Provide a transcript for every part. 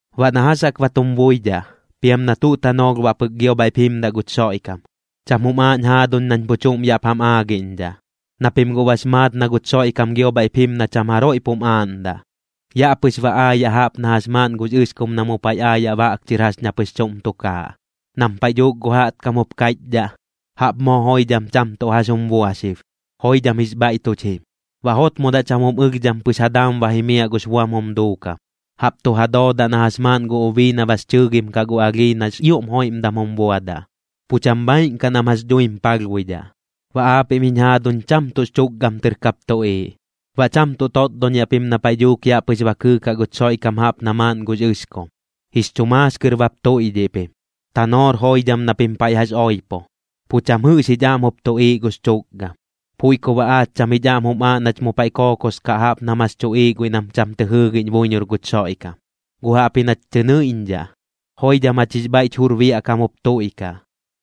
Baꞌ na jax jaꞌk ba tum buidhaꞌ, piam na tuꞌ tanoolh baꞌ pɨk gio bhaiꞌp jimdaꞌ guch Xoiꞌkam, cham jum aaꞌñ jaaduñ nañ pu chuꞌm yaꞌp jam aagiꞌñdhaꞌ, na pim guꞌ bax maat na guch Xoiꞌkam gio bhaiꞌp jim na cham jaroiꞌ pum aaꞌndaꞌ. Yaꞌ pɨx ba aayaꞌ jaꞌp na jax maaꞌn gux ɨxkum na mu paiꞌ aayaꞌ baꞌk chɨr jax ña pɨx chuꞌm tukaaꞌ. Nam paiꞌ dhuuk gu jaꞌtkam jup kaiꞌchdhaꞌ: “Jaꞌp moo joidham cham tuꞌ jax jum bua xib, joidham jix bhaiꞌ tuch jim”, baꞌ jotmodaꞌ cham jum ɨlhdham pɨx ja daam ba jimiaꞌ gux buam jum duukam, jaꞌp tu ja doodaꞌ na jax maaꞌn gu ubii na bax chɨɨgim kaꞌ gu alhii nax ioꞌm joiꞌmdam jum buadaꞌ. Pu cham bhaaiꞌn kaꞌ nam jax dhuim palhbuidhaꞌ. Baꞌ aapiꞌm jiñ jaaduñ cham tuꞌx chukgam tɨr kap tuꞌiiꞌ, baꞌ cham tuꞌ totdoñiaꞌ pim na paiꞌ dhuuk yaꞌ pɨx ba kɨɨkaꞌ guch Xoiꞌkam jaꞌp na maaꞌn gux ɨxkum. Jix chu maax kɨr bap tuiꞌdhiꞌ pim, tanoor joidham na pim paiꞌ jax oipo, pu cham jɨꞌx jich aꞌm jup tuꞌiiꞌ gux chukgam. Puiꞌ ku baꞌ aach cham jich aꞌm jum aaꞌ nach mu paiꞌ kookos kaꞌ jaꞌp nam jax tuꞌiiꞌ guiꞌ nam cham tɨ jɨɨgiꞌñ buiñor guch Xoiꞌkam, guꞌ jaꞌpji nach tɨ nɨiꞌñdhaꞌ, joidham jach jix bhaiꞌch jur biaꞌ kam jup tuiꞌkaꞌ.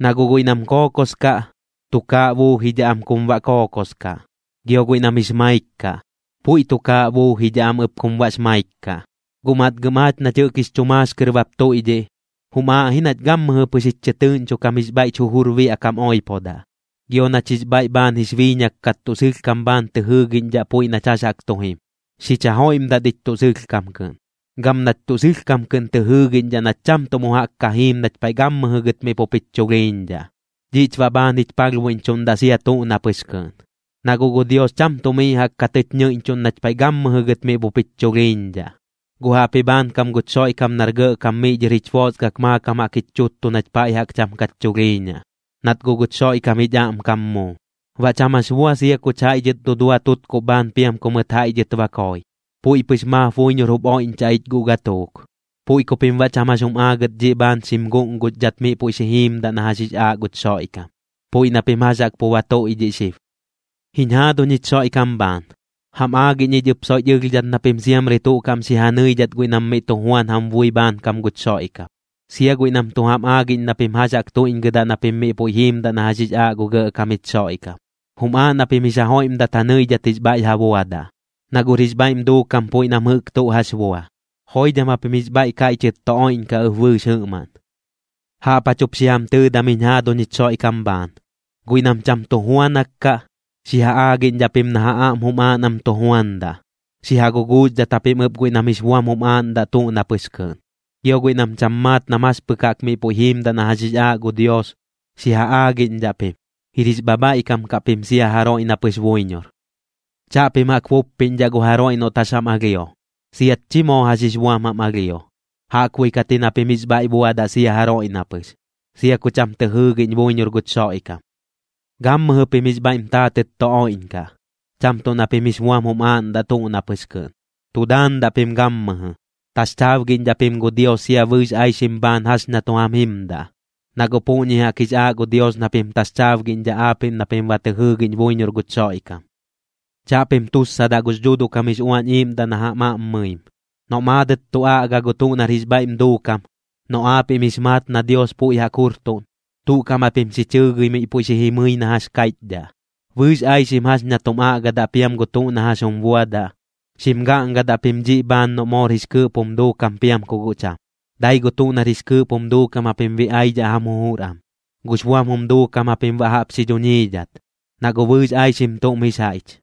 Na guꞌ guiꞌ nam kookos kaꞌ, tukaaꞌ buujidhaꞌ am kum baꞌ kookos kaꞌ, gio guiꞌ nam jix maik kaꞌ, puiꞌ tukaaꞌ buujidhaꞌ am ɨp kum baꞌx maik kaꞌ. Guꞌ matgɨm aach nach jɨꞌk jix chu maax kɨr bap tuiꞌdhiꞌ, jum aaꞌ ji nach gammɨjɨ pɨx jich chɨtɨɨꞌñcho kam jix bhaiꞌch jujur biaꞌ kam oipodaꞌ, gio nach jix bhaiꞌ bhaan jix biiñak kat tuꞌ sɨlhkam bhaan tɨ jɨɨgiꞌñdhaꞌ puiꞌ nach jax jaꞌk tu jim. Xich jajoiꞌmdat ich tuꞌ sɨlhkam kɨꞌn, gam nach tuꞌ sɨlhkam kɨꞌn tɨ jɨɨgiꞌñdhaꞌ nach cham tuꞌ mu jaꞌk ka jiim nach paiꞌ gammɨjɨ gɨt miꞌ pup jich chulhiiñdhaꞌ. Dhiꞌch baꞌ bhaan jich palhbuiꞌñchuꞌndaꞌ sia tuꞌ na pɨx kɨꞌn. Na guꞌ gu Dios cham tuꞌ miꞌ jaꞌk ka tɨch ñɨiꞌñchuꞌn nach paiꞌ gammɨjɨ gɨt miꞌ pup jich chulhiiñdhaꞌ, guꞌ jaꞌpji bhaankam guch Xoiꞌkam nar Gɇꞌkam miꞌ dhɨr jich boosgak maakam jaꞌk jich chuttu nach paiꞌ jaꞌk cham kach chulhiiñaꞌ. Nat guꞌ guch Xoiꞌkam jich aꞌmkam muu, baꞌ cham jax bua sia kuch jaiꞌ dhɨt dudua tutkuꞌ bhaan piam ku mɨt jaiꞌ dhɨt ba koi, puiꞌ pɨx maap buiñor jup oiꞌñchaꞌ ich guꞌ gatuuk. Puiꞌ ku pim baꞌ cham jax jum aagɨt dhiꞌ bhaan xim guꞌnguxdhat miꞌ puiꞌ xi jiimdaꞌ na jax jix aaꞌ guch Xoiꞌkam, puiꞌ na pim jax jaꞌk pu ba tuiꞌdhiꞌ xib. Jiñ jaaduñ jich Xoiꞌkam bhaan, jam aagiꞌñ ich ɨp soiꞌch ɨlhdhat na pim siamri tuꞌ kaꞌm xi ja nɨidhat guiꞌ nam miꞌ tu juan jam bui bhaankam guch Xoiꞌkam, sia guiꞌ nam tu jam aagiꞌñ na pim jax jaꞌk tuiꞌñgɨdaꞌ na pim miꞌ puiꞌ jiimdaꞌ na jax jix aaꞌ gu Gɇꞌkam jich Xoiꞌkam. Jum aaꞌ na pim jix ja joiꞌmdat ja nɨidhat jix bhaiꞌ ja buadaꞌ, na guꞌr jix bhaiꞌm duukam puiꞌ nam jɨꞌk tuꞌ jax bua. Joidham japim jix bhaiꞌ kaiꞌchɨt tu oiꞌñkaꞌ ɨp bɨɨx jɨꞌmaꞌn. Jaꞌp jach jup xi jam tɨɨdam jiñ jaaduñ jich Xoiꞌkam bhaan, guiꞌ nam cham tu juanak kaꞌ, xi ja aagiꞌñdhaꞌ pim na ja aꞌm jum aaꞌ nam tu juandaꞌ. Xi ja guguuxdhat japim ɨp guiꞌ nam jix buam jum aaꞌndaꞌ tuꞌ na pɨx kɨꞌn. Gio guiꞌ nam cham maat nam jax pɨk jaꞌk miꞌ puiꞌ jiimdaꞌ na jax jix aaꞌ gu Dios, xi ja aagiꞌñdhaꞌ pim. Jir jix bhabhaiꞌkam kaꞌ pim sia jaroiꞌ na pɨx buiñor. Chaꞌpim jaꞌk buppiꞌñdhaꞌ gu jaroiꞌ noꞌt jax jam alhio, siat chi moo jax jix buam jam alhio. Jaꞌkbuiꞌ kat ji na pim jix bhaiꞌ buadaꞌ sia jaroiꞌ na pɨx, sia ku cham tɨ jɨɨgiꞌñ buiñor guch Xoiꞌkam. Gammɨjɨ pim jix bhaiꞌm taatɨt tu oiꞌñkaꞌ, cham tuꞌ na pim jix buam jum aaꞌndaꞌ tuꞌ na pɨx kɨꞌn. Tu daandaꞌ pim gammɨjɨ. Taxchaabgiꞌñdhaꞌ pim gu Dios sia bɨɨx aixim bhaan jax ña tu jam jimdaꞌ, na guꞌ puꞌñi jaꞌk jix aaꞌ gu Dios na pim taxchaabgiꞌñdhaꞌ aapiꞌm na pim ba tɨ jɨɨgiꞌñ buiñor guch Xoiꞌkam. Chaꞌpim tussadaꞌ gux Dhuuduꞌ kam jix Uañ Iiꞌmdaꞌ na jam aꞌm mɨim. Noꞌ maadɨt tu aꞌga gu tuꞌ nar jix bhaiꞌm duukam, noꞌ aapiꞌm jix maat na Dios puiꞌ jaꞌk jurtuꞌn, tuꞌ kaꞌm japim xi chɨɨgɨi miꞌ puiꞌ xi jimɨi na jax kaiꞌchdhaꞌ. Bɨɨx aixim jax ña tum aꞌgadaꞌ piam gu tuꞌ na jax jum buadaꞌ, xim gaꞌngadaꞌ pim dhiꞌ bhaan noꞌ moor jix kɨɨꞌp jum duukam piam ku guꞌ cham. Dai gu tuꞌ nar jix kɨɨꞌp jum duukam japim biꞌaidhaꞌ jam jujur am, gux buam jum duukam japim baꞌ jaꞌp xi dhuñiidhat, na guꞌ bɨɨx aixim tuꞌm jix jaiꞌch.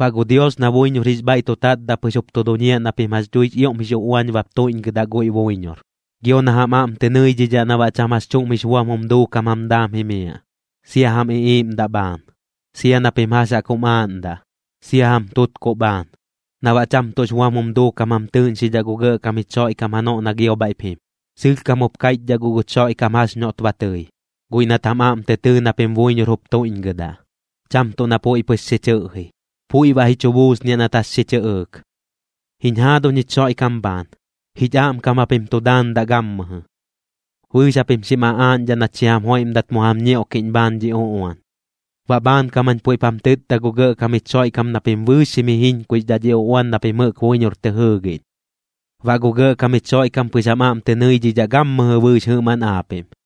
Baꞌ gu Dios na buiñor jix bhaiꞌ tu tatdaꞌ pɨx jup tu duñiaꞌ na pim jax dhuix ioꞌm jix uꞌuañ bap tuiꞌñgɨdaꞌ guiꞌ buiñor, gio na jam aꞌm tɨ nɨidhidhaꞌ na baꞌ cham jax chuꞌm jix buam jum duukam jam daam jimiaꞌ, sia jam iꞌiiꞌmdaꞌ bhaan, sia na pim jax jaꞌk jum aaꞌndaꞌ, sia jam tutkuꞌ bhaan, na baꞌ cham tuꞌx buam jum duukam jam tɨɨꞌñxidhaꞌ gu Gɇꞌkam jich Xoiꞌkam janoꞌ na gio bhaiꞌp jim. Sɨlhkam jup kaiꞌchdhaꞌ guꞌ guch Xoiꞌkam jax noꞌt ba tɨi, guiꞌ nat jam aꞌm tɨ tɨɨ na pim buiñor jup tuiꞌñgɨdaꞌ, cham tuꞌ na puiꞌ pɨx xi chɨꞌji. Puiꞌ baꞌ ji chu buusniaꞌ nat jax xi chɨꞌɨɨk. Jiñ jaaduñ jich Xoiꞌkam bhaan, jich aꞌmkam japim tu daandaꞌ gammɨjɨ. Bɨɨx japim xim aꞌaaꞌñdhaꞌ nach xi jam joiꞌmdat mu jam ñioꞌkiꞌñ bhaan dhi uꞌuan. Baꞌ bhaankam jañ puiꞌp jam tɨtda gu Gɇꞌkam jich Xoiꞌkam na pim bɨɨx xim jijiñkuixdhaꞌ dhi uꞌuan na pim jɨꞌk buiñor tɨ jɨɨgiꞌñ. Baꞌ gu Gɇꞌkam jich Xoiꞌkam pɨx jam aꞌm tɨ nɨidhidhaꞌ gammɨjɨ bɨɨx jɨꞌmaꞌn aapiꞌm.